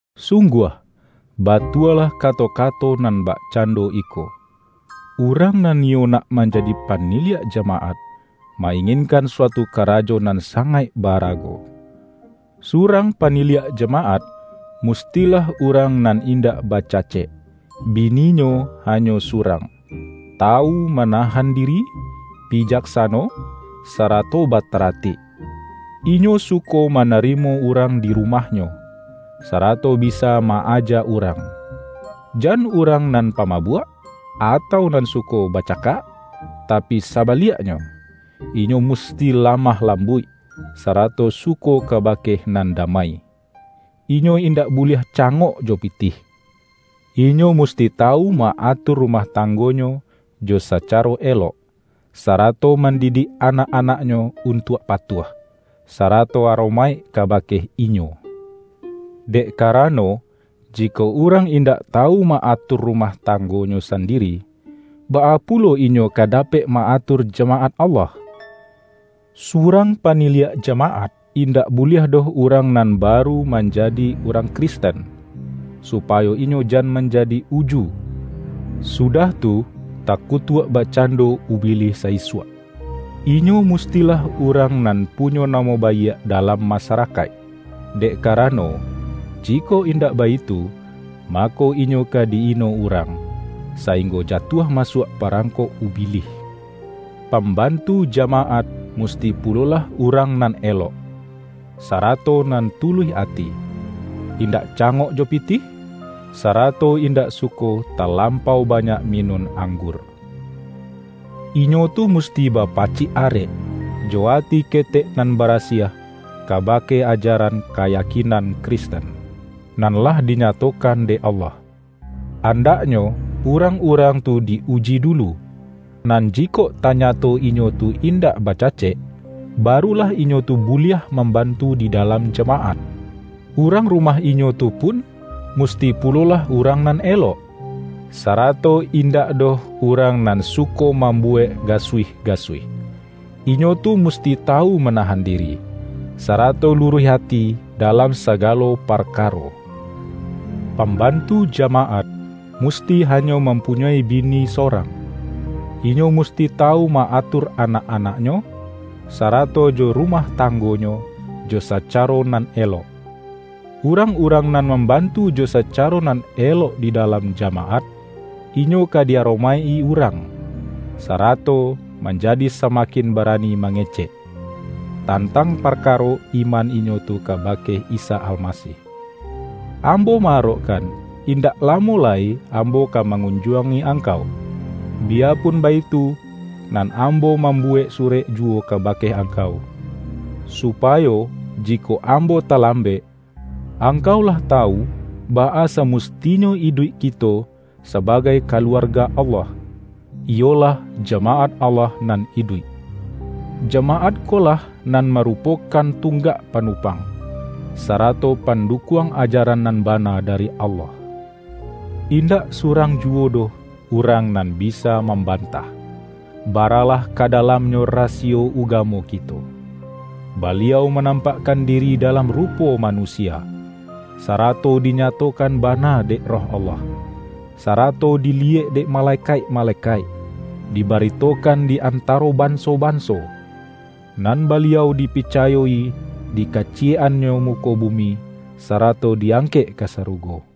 Sungguah, batualah kato-kato nan bakcando iko,”Urang nan niyo nak manjadi paniliak jamaat, ma-inginkan suatu karajo nan sangaik ba-arago.” Surang paniliak jamaat, mustilah urang nan indak bacacek, bi-ninyo hanyo surang, tawu manahan diri, bijaksano, sarato bataratik; inyo suko manarimo urang di rumahnyo, sarato bisa ma-aja urang; jan urang nan pamabuak, atau nan suko baca-kak. Tapi sabaliaknyo, inyo musti la-mah lambuik, sarato suko kabake nan damai. Inyo indak buliah cangok jo pitih. Inyo musti tawu ma-atur ru-mah tanggonyo jo sacaro elok, sara-to mandidik anak-anaknyo untuak patuah, sarato aromaik kabake inyo. Dek karano, jikok urang indak tawu ma-atur rumah tanggonyo sandiri, baa pulo inyo ka dapek ma-atur jama-at Allah? Surang paniliak jamaat, indak buliah doh urang nan baru man-jadi urang Kristen, supayo inyo jan manjadi uju, sudah tu, takutuak bak-cando Ubilih sa-isuak. Inyo mustilah urang nan punyo namo baiak dalam masarakaik; dek karano, jikok indak baitu, mako inyo ka di-ino urang, sa-inggo jatuah masuak parangkok Ubi-lih. Pambantu jamaat musti pulolah urang nan elok, sarato nan tuluih ati; indak cangok jo pitih, sarato indak suko talampau banyak minun ang-gur. Inyo tu musti bapacik arek, jo ati ketek nan barasiah kabake ajaran kayakinan Kristen, nan lah dinyato-kan dek Allah. Andaknyo urang-urang tu di-uji dulu, nan jikok tanyato inyo tu indak bacacek, barulah inyo tu buliah mambantu di dalam jama-at. Urang rumah inyo tu pun, musti pulolah urang nan elok, sarato indak doh urang nan suko mambuwek ga-suih-gasuih. Inyo tu musti tawu ma-nahan diri, sarato luruih ati dalam sagalo parkaro. Pambantu jama-at, musti hanyo mampunyoi bini so-rang. Inyo musti tawu ma-atur anak-anaknyo, sarato jo rumah tanggonyo jo sacaro nan elok. Urang-urang nan mambantu jo sacaro nan elok di dalam jamaat, inyo ka di-aromaik-i urang, sarato manjadi samakin bara-ni mangecek, tantang parkaro iman inyo tu kabake Isa Almasih. Ambo ma-arokkan, indak lamo lai ambo ka mangunjuangi angkau. Biya-pun baitu, nan ambo mambuwek surek juwo kabake angkau, supayo, jikok ambo talambek, angkau lah tawu baa samustinyo iduik kito sabagai kaluarga Allah, iyolah jamaat Allah nan iduik. Jamaat ko lah nan marupokan tunggak panupang, sarato pandukuang ajaran nan bana dari Allah. Indak surang ju-wo doh urang nan bisa mambantah, ba-ralah ka dalamnyo rasiyo ugamo kito: Baliau manampakkan diri dalam rupo manusia, sarato dinyatokan bana dek Roh Allah, sarato diliyek dek malekaik-malekaik. Dibaritokan di antaro banso-banso, nan Baliau dipicayo-i di kaciyek-annyo muko bumi, sarato di-angkek ka sarugo.